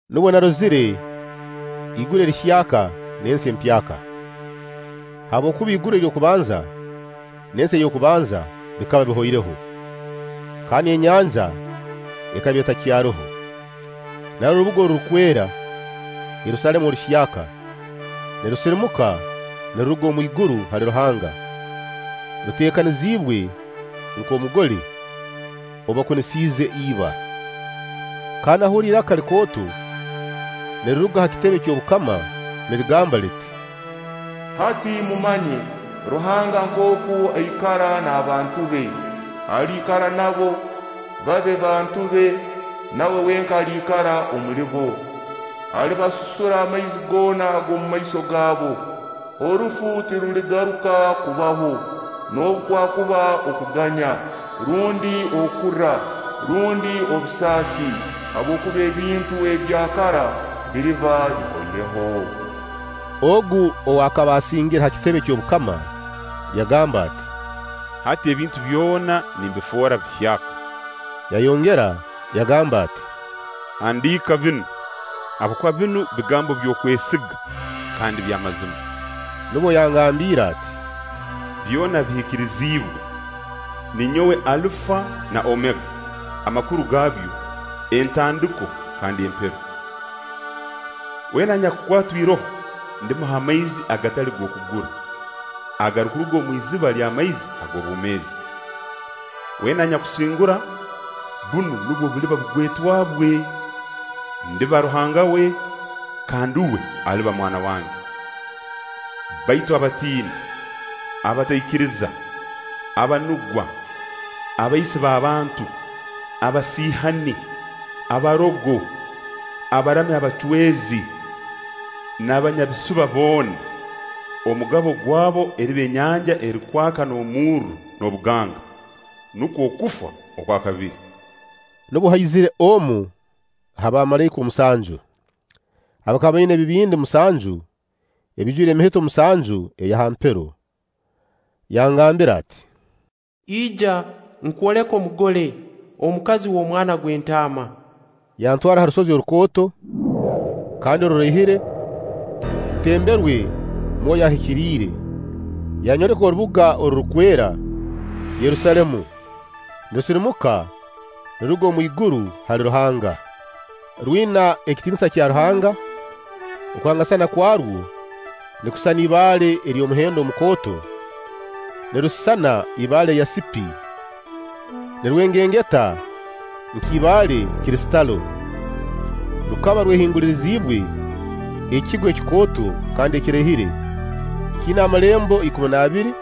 Nubwo narozire iguru erihyaka n'ensi empyaka. Habwokuba iguru ery'okubanza n'ensi ey'okubanza bikaba bihoireho, kandi enyanja ekaba etakyaroho. Narora orubuga orurukwera, Yerusaalemu oruhyaka, nirusirimuka niruruga omwiguru hali Ruhanga, ruteekaniziibwe nk' omugole ou bakunisiize iba. Kandi nahurra iraka likooto niriruga ha kitebe ky'obukama nirigamba liti: “Hati mumanye Ruhanga nkooku aikara n'abantu be. Aliikara nabo, babe bantu be, nawe wenka aliikara omulibo. Alibasusura amaizi goona ag'omu maiso gabo. Orufu tiruligaruka kubaho, noobu kwakuba okuganya, rundi okurra, rundi obusaasi. Habwokuba ebintu ebya kara biriba bihoireho.” Ogu ow'akaba asingire ha kitebe eky'obukama yagamba ati: “Hati ebintu byona nimbifoora bihyaka!” Yayongera yagamba ati: “Handiika binu, habwokuba binu bigambo by'okwesiga kandi by'amazima.” Nubwo yangambiire ati: “Byona bihikiriziibwe! Ninyowe Alufa na Omega, amakuru gaabyo: Entandiko kandi Empero. Weena anyakukwatwa iroho ndimuha amaizi agatali g'okugura, agarukuruga omu iziba ery'amaizi ag'obwomeezi. Weena anyakusingura, bunu nubwo buliba bugwetwa bwe: Ndiba Ruhanga we, kandi uwe aliba mwana wange. Baitu abatiini, abataikiriza, abanugwa, abaisi b'abantu, abasiihani, abarogo, abaramya abacwezi n'abanyabisuba boona, omugabo gwabo eriba enyanja erukwaka omurro n'obuganga. Nukwo okufa okwa kabiri.” Nubwo haizire omu ha baamalaika omusanju, abakaba baina ebibindi musanju ebiijwire emihito musanju eya ha mpero, yangambira ati: “Ija, nkwoleke Omugole, omukazi w'Omwana gw'Entaama.” Yantwara ha rusozi orukooto kandi oruraihire ntemberwe Mwoyo Ahikiriire, yanyoleka orubuga orurukwera, Yerusaalemu, nirusirimuka niruruga omwiguru hali Ruhanga, rwina ekitiinisa kya Ruhanga. Okwangasana kwarwo nikusisana ibaale ery'omuhendo omukooto, nirusisana ibaale yasipi, nirwengengeta nka ibaale kristalo. Rukaba rwehinguliriziibwe ekigo ekikooto kandi ekiraihire. Kiina amalembo ikumi n'abiri,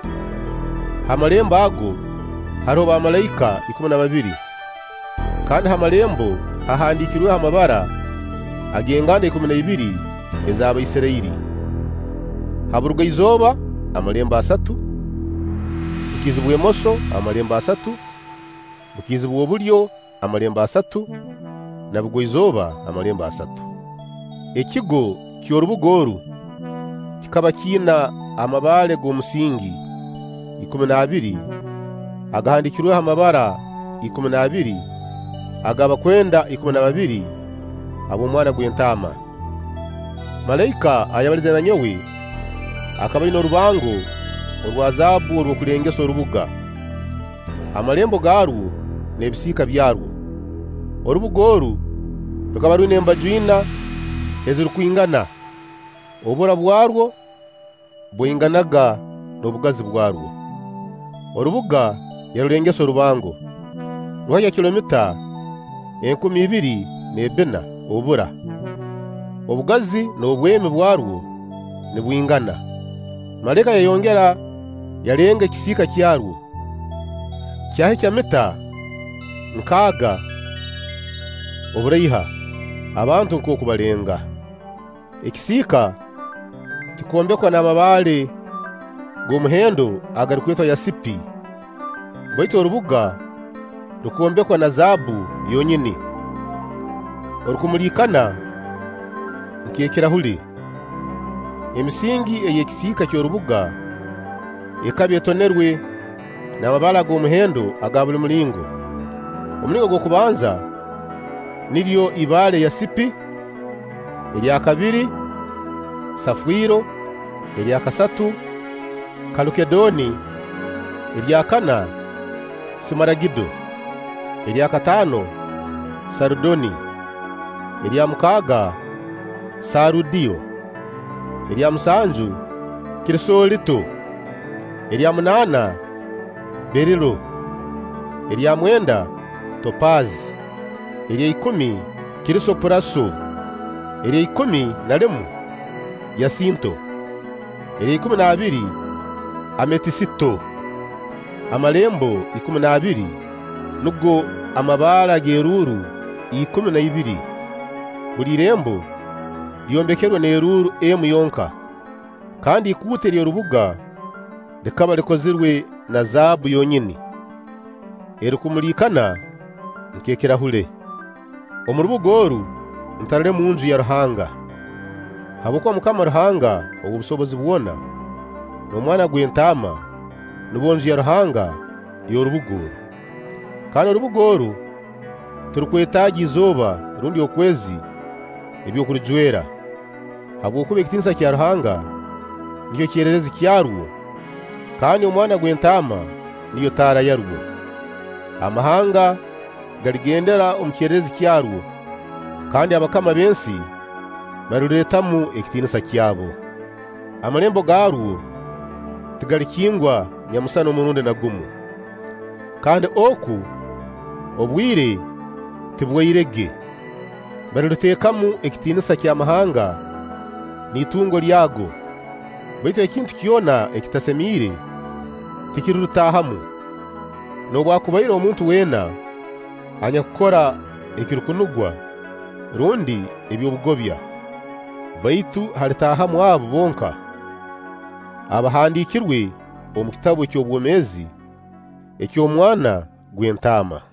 ha malembo ago haroho bamalaika ikumi na babiri; kandi na ha malembo hahandiikirweho amabara ag'enganda ikumi na ibiri ez'Abaisirairi. Ha Burugaizooba amalembo asatu, bukiizi bw'emoso amalembo asatu, bukiizi bw'obulyo amalembo asatu, na Bugwa-izooba amalembo asatu. Ekigo ky'orubuga oru kikaba kiina amabaale g'omusingi ikumi n'abiri agahandiikirweho amabara ikumi n'abiri ag'abakwenda ikumi na babiri ab'Omwana gw'Entaama. Malaika ayabalize na nyowe, akaba aina orubango orwa zaabbu orw'okulengesa orubuga, amalembo gaarwo n'ebisiika byarwo. Orubuga oru rukaba rwina embaju ina ezirukwingana, obura bwarwo bwainganaga n'obugazi bwarwo. Orubuga yarulengesa orubango, rwahikya kilomita enkumi ibiri n'ebbina; obura, obugazi n'obwemi bwarwo nibwingana. Malaika yayongera yalenga ekisiika kyarwo, kyahikya mita nkaaga oburaiha, abantu nkooku baalenga. Ekisiika kikombekwa na mabaale g'omuhendo agarukwetwa yasipi, baitu orubuga rukombekwa na zaabbu yonyini, erukumuliikana nk'ekirahule. Emisingi ey'ekisiika ky'orubuga ekaba etonerwe n'amabaale ag'omuhendo aga buli mulingo. Omulingo ogw'okubanza, niryo ibaale yasipi, erya kabiri saafiro, erya kasatu kalukeedoni, erya kana simaragido, erya kataano sarudoni, erya mukaaga saarudiyo, erya musanju kirisoolito, erya munaana beerilo, erya mwenda topaazi, erya ikumi krisoopuraso, erya ikumi na limu yasinto, erya ikumi n'abiri ametisito. amalembo ikumi n'abiri, nugo amabaale ag'eruuru ikumi n'ibiri, buli irembo lyombekerwe n'eruuru emu yonka; kandi ikuute ery'orubuga likaba likozirwe na zaabbu yonyini, erukumuliikana nk'ekirahule. Omu rubuga oru ntarolemu Nju ya Ruhanga, habwokuba MUKAMA Ruhanga ow'obusobozi bwona n'Omwana gw'Entaama nubo Nju ya Ruhanga y'orubuga oru. Kandi orubuga oru tirurukwetaaga izooba rundi okwezi eby'okurujwera, habwokuba ekitiinisa kya Ruhanga nikyo kyererezi kyarwo kandi Omwana gw'Entaama niyo taara yarwo. Amahanga galigendera omu kyererezi kyarwo; kandi abakama b'ensi baliruleetamu ekitiinisa kyabo. Amalembo gaarwo tigalikingwa nyamusana omurundi na gumu; kandi oku, obwire tibwairege. Baliruleetamu ekitiinisa ky'amahanga n'itungo lyago. Baitu ekintu kyona ekitasemiire tikirirutaahamu, noobwakubaire omuntu weena anyakukora ekirukunugwa rundi eby'obugobya; baitu halitaahamu abo bonka abaahandiikirwe omu kitabu eky'obwomeezi eky'Omwana gw'Entaama.